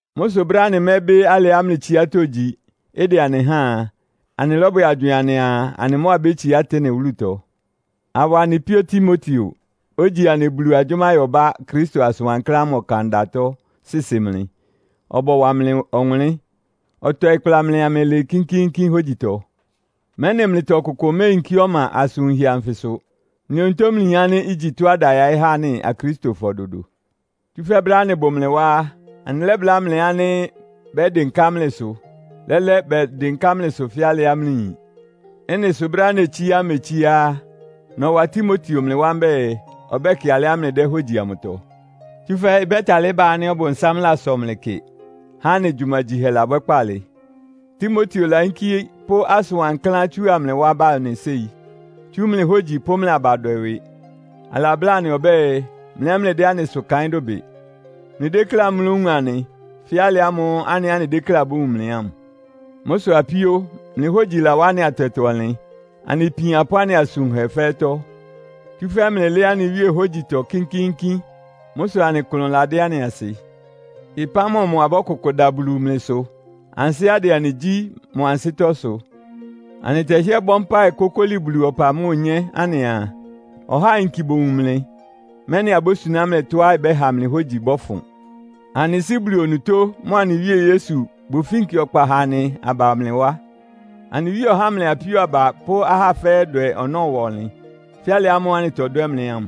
Mʋ́ sʋ brɛ́á anɩmɛ́bɩ́ alɩá mlɩ tsiátɔ́ igyi, ɩdɛ anɩ háan a, anɩlɔ́bwɛ agywɩɩn anɩaa, anɩ mʋ́ abétsiá Atene wúlutɔ, awa anɩ píó Timoteo, ogyi anɩ Bulu agyʋ́máyɔbá Kristo asʋn wankláán ámʋ ɔkandatɔ sɩsɩ mlɩ, ɔbɔwa mlɩ ɔwʋnlɩ́n. Ɔtɔɩ kpla mlɩ amlɩlɩɩ kínkíínkín hógyitɔ, mɛ́nɩ mlɩtɔ ɔkʋkʋ méeyinkí ɔma asʋn wunhɛ anfɩ sʋ. Mlɩ onutó mlɩyin ánɩ́ igyi tɔ́á ɩda yaɩ́ há anɩ Akristofɔ dodo. Tsúfɛ́ brɛ́á anɩbʋ mlɩ wá á, anɩlɛ́bláa mlɩ ánɩ́ bɛ́dɩnká mlɩsʋ. Lɛ́lɛ bɛdɩnká mlɩsʋ fɛ́ alɩá mlɩyin. Ɩ́nɩ sʋ brɛ́á netsíá mmetsíá á, nɔwa Timoteo mlɩ wá mbɛ́ɛ, ɔbɛ́kɩ alɩá mlɩdɛ́ hógyi amʋtɔ. Tsúfɛ́ ɩbɛ́talɩ́ ba ánɩ́ Ɔbʋnsám lasɔ mlɩ kɩ, há anɩ gyumagyihɛ labwɛ́ kpaalɩ. Timoteo layínkí pʋ́ asʋn wankláán tsúa mlɩ wá ba anɩ séi, tsú mlɩ hógyi pʋ́ mlɩ abadwɛ ɩwɩ. Alabláa anɩ ɔbɛ́ɛ, mlɩ ɛ́ mlɩdɛ́ anɩsʋ kaɩ́n dʋbɩ. Mlɩdékléá mlówun anɩ, fɛ́ alɩ ámʋ́ʋ́ anɩ ɛ́ anɩdékléá abówun mlɩ ámʋ. Mʋ́ sʋ apíó, mlɩ hógyi lawá anɩ atɛtɔ-ɔnlɩn, anɩ ipian pʋ́ anɩ asʋn wunhɛ fɛ́ɛ́tɔ́; tsúfɛ́ mlɩlɩ́ɩ́ anɩ Wíe hógyitɔ kínkíínkín. Mʋ́ sʋ anɩ klʋn ládɩ́ anɩ asɩ. Ɩpán mɔmʋ abɔ́kʋkʋ da Bulu mlɩ sʋ, ansɩ́á ɩdɛ anɩ gyí mʋ ansɩ́tɔ́ sʋ? Anɩtɛhɩ́ɛ́ bɔ́ mpáɩ kókóli Bulu ɔpa mʋ́a onyé anɩaa, ɔhá ayinki bowun mlɩ, mɛ́nɩ abósuná mlɩ tɔ́á ɩbɛ́ha mlɩ hógyi bɔ́fʋn. Anɩ Sɩ́ Bulu onutó mʋa anɩ Wíe Yesu bʋfínki ɔkpa ha anɩ aba mlɩ wá. Anɩ Wíe ɔhá mlɩ apíó aba pʋ́ ahá fɛ́ɛ́ dwɛ ɔnɔ́ ɩwa ɔnlɩn, fɛ́ alɩ ámʋ́ʋ́ anɩtɔdwɛ́ mlɩ ámʋ.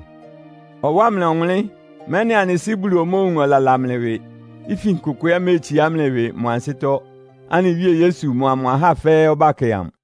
Ɔwá mlɩ ɔwʋnlɩ́n, mɛ́nɩ anɩ Sɩ́ Bulu omóowun ɔlala mlɩ ɩwɩ, ifin kʋkʋ ɛ́ méetsiá mlɩ ɩwɩ mʋ ansɩ́tɔ́, anɩ Wíe Yesu mʋa mʋ ahá fɛ́ɛ́ ɔbákɛ amʋ.